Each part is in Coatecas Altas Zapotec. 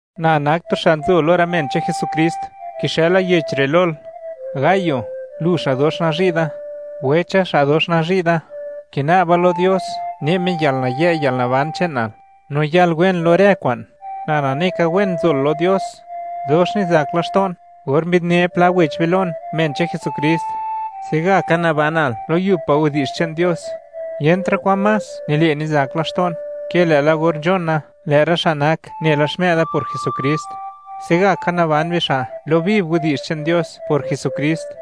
Na nak tu xa' nzo lo rë men che'n Jesukrist; kixëla yech re' lol, Gayo, lu xa' dox nazhi' da. Wecha, xa' dox nazhi' da, kina'ba lo Dios ne' Me yalnayë' no yalnaban che'nal, no yal wen lo rë kwa'n; na nane ka, wen nzol lo Dios. Dox nizak laxto'n or mbi'dne pla wech be lon, men che'n Jesukrist, se'gaka nabanal lo yub pa' widi'zh che'n Dios. Yentra' kwan más nile' nizak laxto'n ke lë'la or nzhona, lë' rë xa' nak nela xmë'da por Jesukrist, se'gaka naban bixa' lo viv widi'zh che'n Dios por Jesukrist.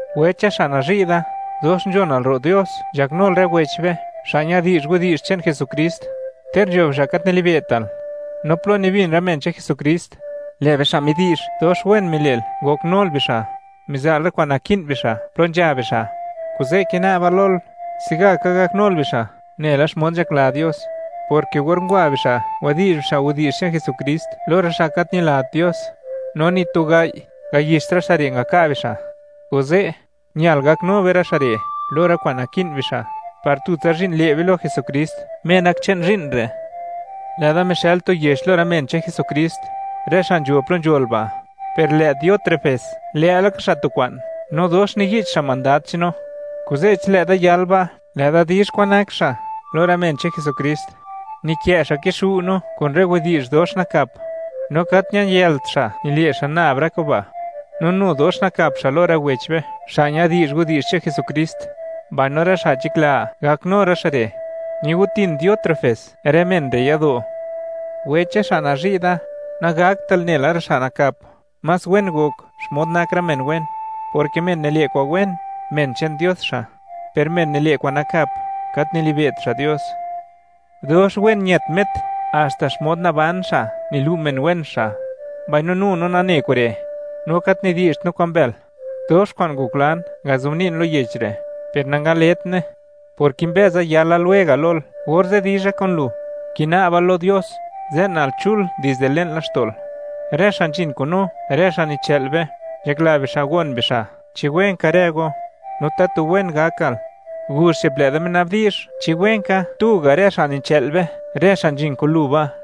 Wecha xa' nazhi' da, dox nzhonal ro' Dios, nzhaknul rë wech be xa' ñadi'zh widi'zh che'n Jesukrist, ter nzho bixa' gat nilibe'tal. No plo nibin rë men che'n Jesukrist, lë' bixa' midi'zh, dox wen mile'l ngoknul bixa', miza'l rë kwa'n naki'n bixa' plo nzha bixa'. Kuze' kina'ba lol, se'gaka gaknul bixa' nela xmod nzhakla Dios, porke or ngwa bixa' ngwadi'zh bixa' widi'zh che'n Jesukrist lo rë xa' gat ñilat Dios, no ni tu gai' ngayixt rë xa' re' ngaka' bixa'. Kuze', ñal gaknu be rë xa' re' lo rë kwa'n naki'n bixa', par tutsa zhi'n le' be lo Jesukrist, Me nak che'n zhi'n re'. Lë'da mixë'l tu yech lo rë men che'n Jesukrist, rë xa' nzho plo nzhol ba', per lë' Diótrefes, lë'laka xa' tu kwa'n, no dox niyich xa' mandad che'n no. Kuze', chi lë'da yal ba', lë'da di'zh kwan nak xa' lo rë men che'n Jesukrist: Nikë' xa' kixu' no kun rë widi'zh dox nakap. No gat ñayëlt xa' nile' xa' nab rë kuba', no nu dox nakap xa' lo rë wech be xa' ñadi'zh widi'zh che'n Jesukrist, mbaino rë xa' nzhakla gaknu rë xa' re', nigo'tin Diótrefes rë men re' yado'. Wecha xa' nazhi' da, nagaktal nela rë xa' nakap, más wen gok xmod nak rë men wen, porke men nile' kwa'n wen, men che'n Dios xa'; per men nile' kwa'n nakap, gat nilibe't xa' Dios. Dox wen ñët Met, haxta xmod naban xa' nilu' men wen xa'; mbaino nu no nane kure', no gat nidi'zht no kwa'n mbël. Dox kwa'n ngoklan ngazobni'n lo yech re', per nangaletne, por kimbëza yala lwega' lol, orze' dizha kun lu. Kina'ba lo Dios, ze'nal chul dizde le'n laxto'l. Rë xa' nzhin kun no, rë xa' nichë'l be, nzhakla bixa' gon bixa': “¿Chi wen ka rë go?”, no, “¿Tatu wen gakal?” Guzh che'p, lë'da minabdi'zh: “¿Chi wen ka?”, tu ga' rë xa' nichë'l be, rë xa' nzhin kun lu ba'.